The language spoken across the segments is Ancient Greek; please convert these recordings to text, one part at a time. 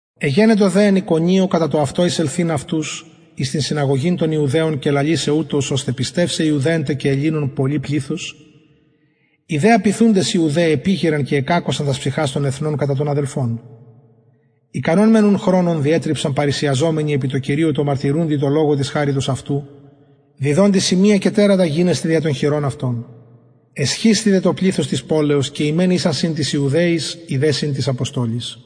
εγενετο δε εν ικονιω κατα το αυτο εισελθειν αυτους εις την συναγωγην των ιουδαιων και λαλησαι ουτως ωστε πιστευσαι ιουδαιων τε και ελληνων πολυ πληθος οι δε απειθουντες ιουδαιοι επηγειραν και εκακωσαν τας ψυχας των εθνων κατα των αδελφων ικανον μεν ουν χρονον διετριψαν παρρησιαζομενοι επι τω κυριω τω μαρτυρουντι τω λογω της χαριτος αυτου διδοντι σημεια και τερατα γινεσθαι δια των χειρων αυτων εσχισθη δε το πληθος της πολεως και οι μεν ησαν συν τοις ιουδαιοις οι δε συν τοις αποστολοις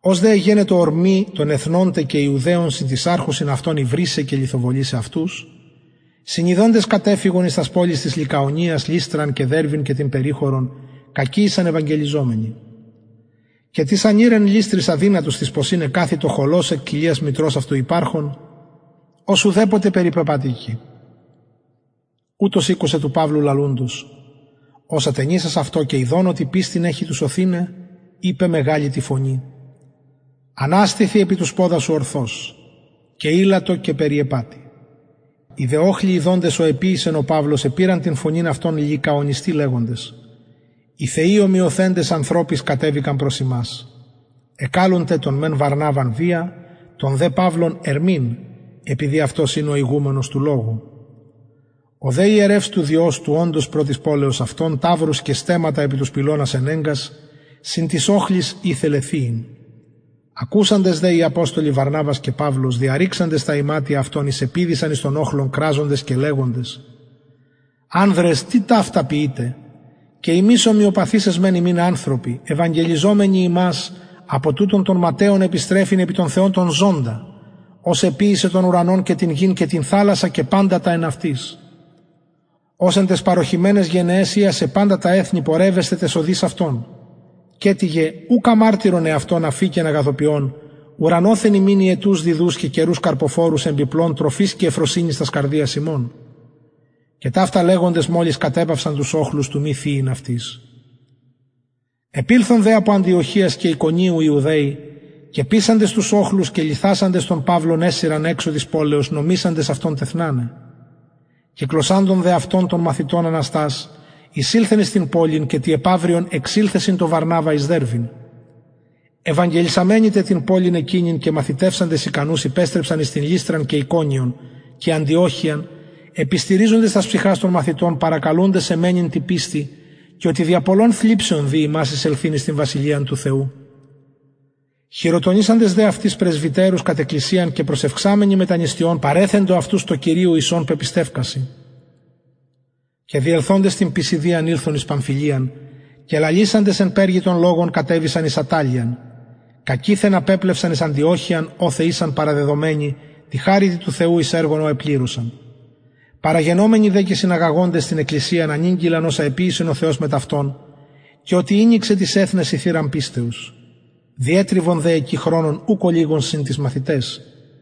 ως δε εγενετο ορμη των εθνων τε και ιουδαιων συν τοις αρχουσιν αυτων υβρισαι και λιθοβολησαι αυτους συνιδοντες κατεφυγον εις τας πολεις της λυκαονιας λυστραν και δερβην και την περιχωρον κακει ησαν ευαγγελιζομενοι και τις ανηρ εν λυστροις αδυνατος τοις ποσιν εκαθητο χωλος εκ κοιλιας μητρος αυτου υπαρχων ος ουδεποτε περιπεπατηκει ουτος ηκουσεν του παυλου λαλουντος ος ατενισας αυτω και ιδων οτι πιστιν εχει του σωθηναι ειπεν μεγαλη τη φωνη αναστηθι επι τους ποδας σου ορθως και ηλλετο και περιεπατει οι δε οχλοι ιδοντες ο εποιησεν ο παυλος επηραν την φωνην αυτων λυκαονιστι λεγοντες οι θεοι ομοιωθεντες ανθρωποις κατεβησαν προς ημας εκαλουν τε τον μεν βαρναβαν δια τον δε παυλον ερμην επειδη αυτος ην ο ηγουμενος του λογου ο δε ιερευς του διος του οντος προ της πολεως αυτων ταυρους και στεμματα επι τους πυλωνας ενεγκας συν τοις οχλοις ηθελεν θυειν ακουσαντες δε οι αποστολοι βαρναβας και παυλος διαρρηξαντες τα ιματια αυτων εισεπηδησαν εις τον οχλον κραζοντες και λεγοντες ανδρες τι ταυτα ποιειτε και ημεις ομοιοπαθεις εσμεν υμιν ανθρωποι ευαγγελιζομενοι υμας απο τουτων των ματαιων επιστρεφειν επι τον θεον τον ζωντα ος εποιησεν τον ουρανον και την γην και την θαλασσαν και παντα τα εν αυτοις ος εν ταις παρωχημεναις γενεαις ειασεν παντα τα εθνη πορευεσθαι ταις οδοις αυτων καιτοιγε ουκ αμαρτυρον εαυτον αφηκεν αγαθοποιων ουρανοθεν υμιν υετους διδους και καιρους καρποφορους εμπιπλων τροφης και ευφροσυνης τας καρδιας ημων και ταυτα λεγοντες μολις κατεπαυσαν τους οχλους του μη θυειν αυτοις επηλθον δε απο αντιοχειας και ικονιου ιουδαιοι και πεισαντες τους οχλους και λιθασαντες τον παυλον εσυρον εξω της πολεως νομισαντες αυτον τεθναναι κυκλωσαντων δε αυτον των μαθητων αναστας εισηλθεν εις την πολιν και τη επαυριον εξηλθεν συν τω βαρναβα εις δερβην ευαγγελισαμενοι τε την πολιν εκεινην και μαθητευσαντες ικανους υπεστρεψαν εις την λυστραν και ικονιον και αντιοχειαν επιστηριζοντες τας ψυχας των μαθητων παρακαλουντες εμμενειν τη πιστει και οτι δια πολλων θλιψεων δει ημας εισελθειν εις την βασιλειαν του θεου χειροτονησαντες δε αυτοις πρεσβυτερους κατ εκκλησιαν προσευξαμενοι μετα νηστειων παρεθεντο αυτους τω κυριω εις ον πεπιστευκεισαν και διελθοντες την πισιδιαν ηλθον εις παμφυλιαν και λαλησαντες εν περγη τον λογον κατεβησαν εις ατταλειαν κακειθεν απεπλευσαν εις αντιοχειαν οθεν ησαν παραδεδομενοι τη χαριτι του θεου εις το εργον ο επληρωσαν παραγενομενοι δε και συναγαγοντες την εκκλησιαν ανηγγειλαν οσα εποιησεν ο θεος μετ αυτων και οτι ηνοιξεν τοις εθνεσιν θυραν πιστεως διετριβον δε εκει χρονον ουκ ολιγον συν τοις μαθηταις